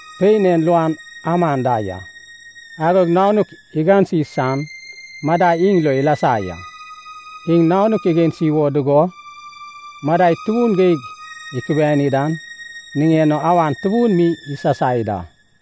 Pein en luan aman da ya. Agod nanuk igansi san madai iŋ lo ilasa ya. Iŋ nanuk igansi wo dugo, madai tubun geig ikubiani dan niŋen o awan tubun mi isasai da.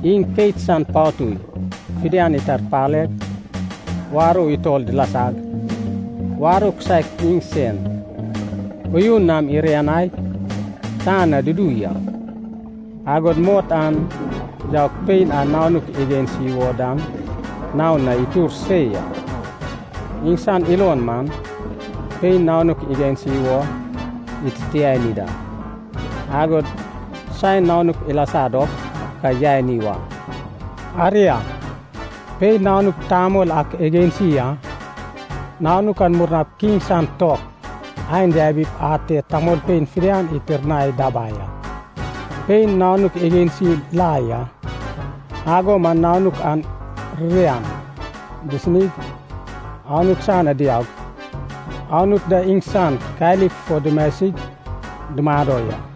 Iŋ keit san patui fidian itarpaleg warou utol dilasag, warou kisaek iŋsen uyun nam irianaig tan na dudu ya. Agod mot an yaug pein a nanuk igansi wo dan naon na itur se ya. Iŋsan ilon man, pein nanuk igansi wo ititiani da, agod saen nanuk ilasa dop ka yani wa. Aria, pein nanuk tamol ak igansi a. Nanuk an murnap kiŋ san tok ain yabip ate tamolpein fidian itirnai dabai a. Pein nanuk igansi la ya, ago man nanuk an ririan disinig, Anut san na diaug, Anut da iŋsan kalik fo dumasig dumado ya.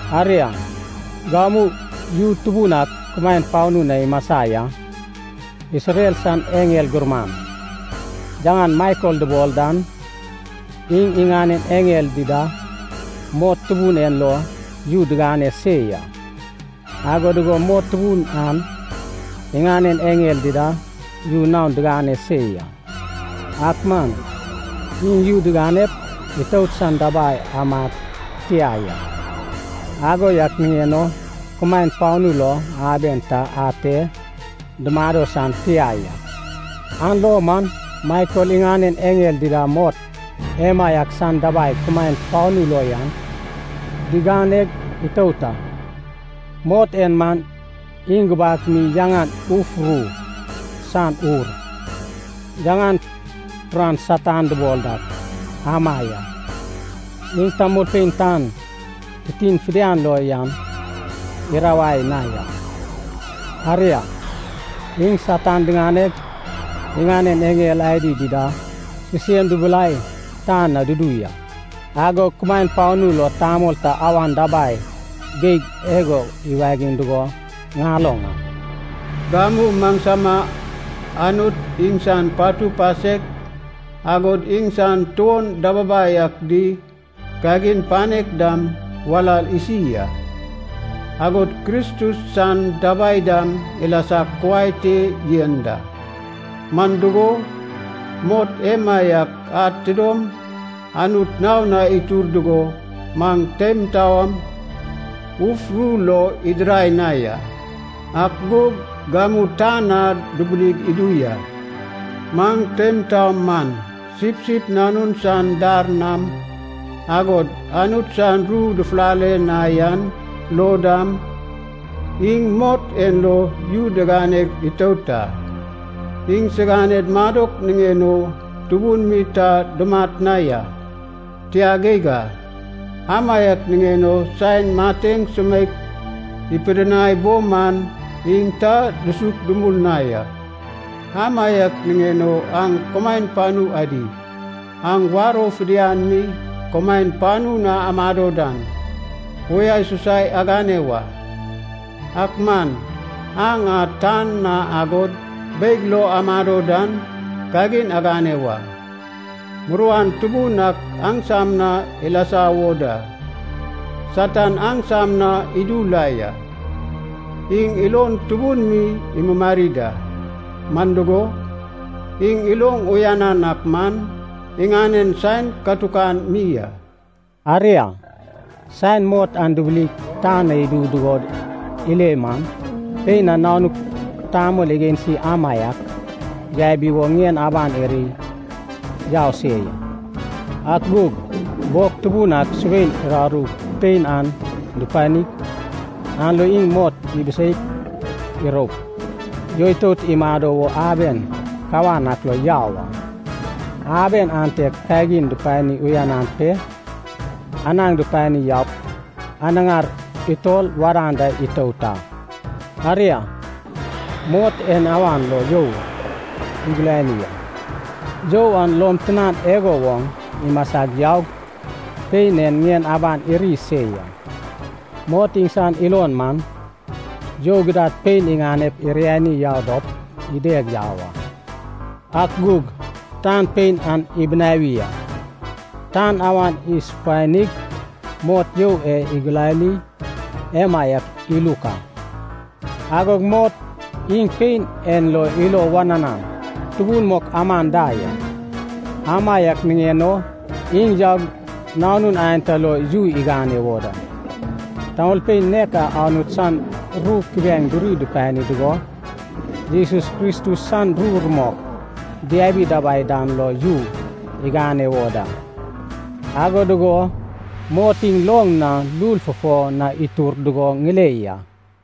Aria, gamu yu tubun ak kumaen panu na imasa ya. Isrel san eŋel gurman, yaŋan Maikel dubol dan, iŋ iŋanen eŋel dida mot tubun en lo yu digane se ya. Ago dugo mot tubun an iŋanen eŋel dida yu naon digane se ya. Ak man iŋ yu diganep itout san dabai amad tia ya. Ago yak niŋen o kumaen panu lo aben ta ate dumado san tia ya. An lo man Maikel iŋanen eŋel dida mot emaiak san dabai kumaen panu lo yan diganeg itout a. Mot en man, iŋ gubak mi yaŋan Uf Ru San Ur, yaŋan turan Satan dubol dak, ama ya. Iŋ tamolpein tan titin fidian lo yan irawai na ya. Aria, iŋ Satan diŋaneg, iŋanen eŋel adi dida sisem dubilai tan na dudu ya. Agog kumaen panu lo tamol ta awan dabai geig igo iwagiŋ dugo ŋaloŋ a. “Gamu maŋsama Anut iŋsan patu pasek, agod iŋsan tuon dababai ak di kagin panek dam walal isi a, agod Kristus san dabai dam ilasag kuai te yen da. Man dugo, mot emaiak ad tidom Anut naon na itur dugo maŋ teim taom uf ru lo idirai na ya, ak gug gamu tan na dubilig idu ya. Maŋ teim taom man, Sipsip Nanun san dar nam, agod Anut san ru dufulale na yan lo dam, iŋ mot en lo yu diganeg itout a. Iŋsiganed madok niŋen o tubun mi ta dumat na ya, tia geig a. Amaiak niŋen o saen mateŋ sumeik ipidinai bo man, iŋ ta dusuk dumul na ya. Amaiak niŋen o aŋ kumaen panu adi, aŋ warou fidian mi kumaen panu na amado dan, uyasusai agane wa. Ak man aŋ a tan na agod beig lo amado dan, kagin agane wa. Muruan tubun ak aŋsam na ilasa wo da. Satan aŋsam na idu la ya. Iŋ ilon tubun mi imumari da, man dugo, iŋ iloŋ uyanan ak man, iŋanen saen katukan mi a.” Aria, saen mot an dubilig tan na idu dugo ile man, pein a nanuk tamol igansi amaiak yabi wo ŋien aban irig yau se ya. Ak gug bog tubun ak subein uraru pein an dupanig, an lo iŋ mot ibiseip iroup, yoitout imado wo aben kawan ak lo yau a. Aben ante kagin dupani uyanan pe, anaŋ dupani yaup anaŋar utol wadan da itout a. Aria, mot en awan lo you igulani a, you an lom tinan igo woŋ imasag yaug, pein en ŋien aban iri se ya. Mot iŋsan ilon man, you gidad pein iŋanep iriani yau dop ideg yau a. Ak gug tan pein an ibinawi a. Tan awan isupanig mot you e igulani emaiak iluk a. Agog mot iŋ pein en lo ilo wananan tubun mok aman da ya. Amaiak niŋen o iŋ yaug nanun aenta lo yu igane wo da. Tamolpein nek a Anut san ru kubiaeŋ duri dupani dugo Jesus Kristus san ru rumok diabi dabai dan lo yu igane wo da. Ago dugo mot iŋ loŋ na lul fufo na itur dugo ŋile ya.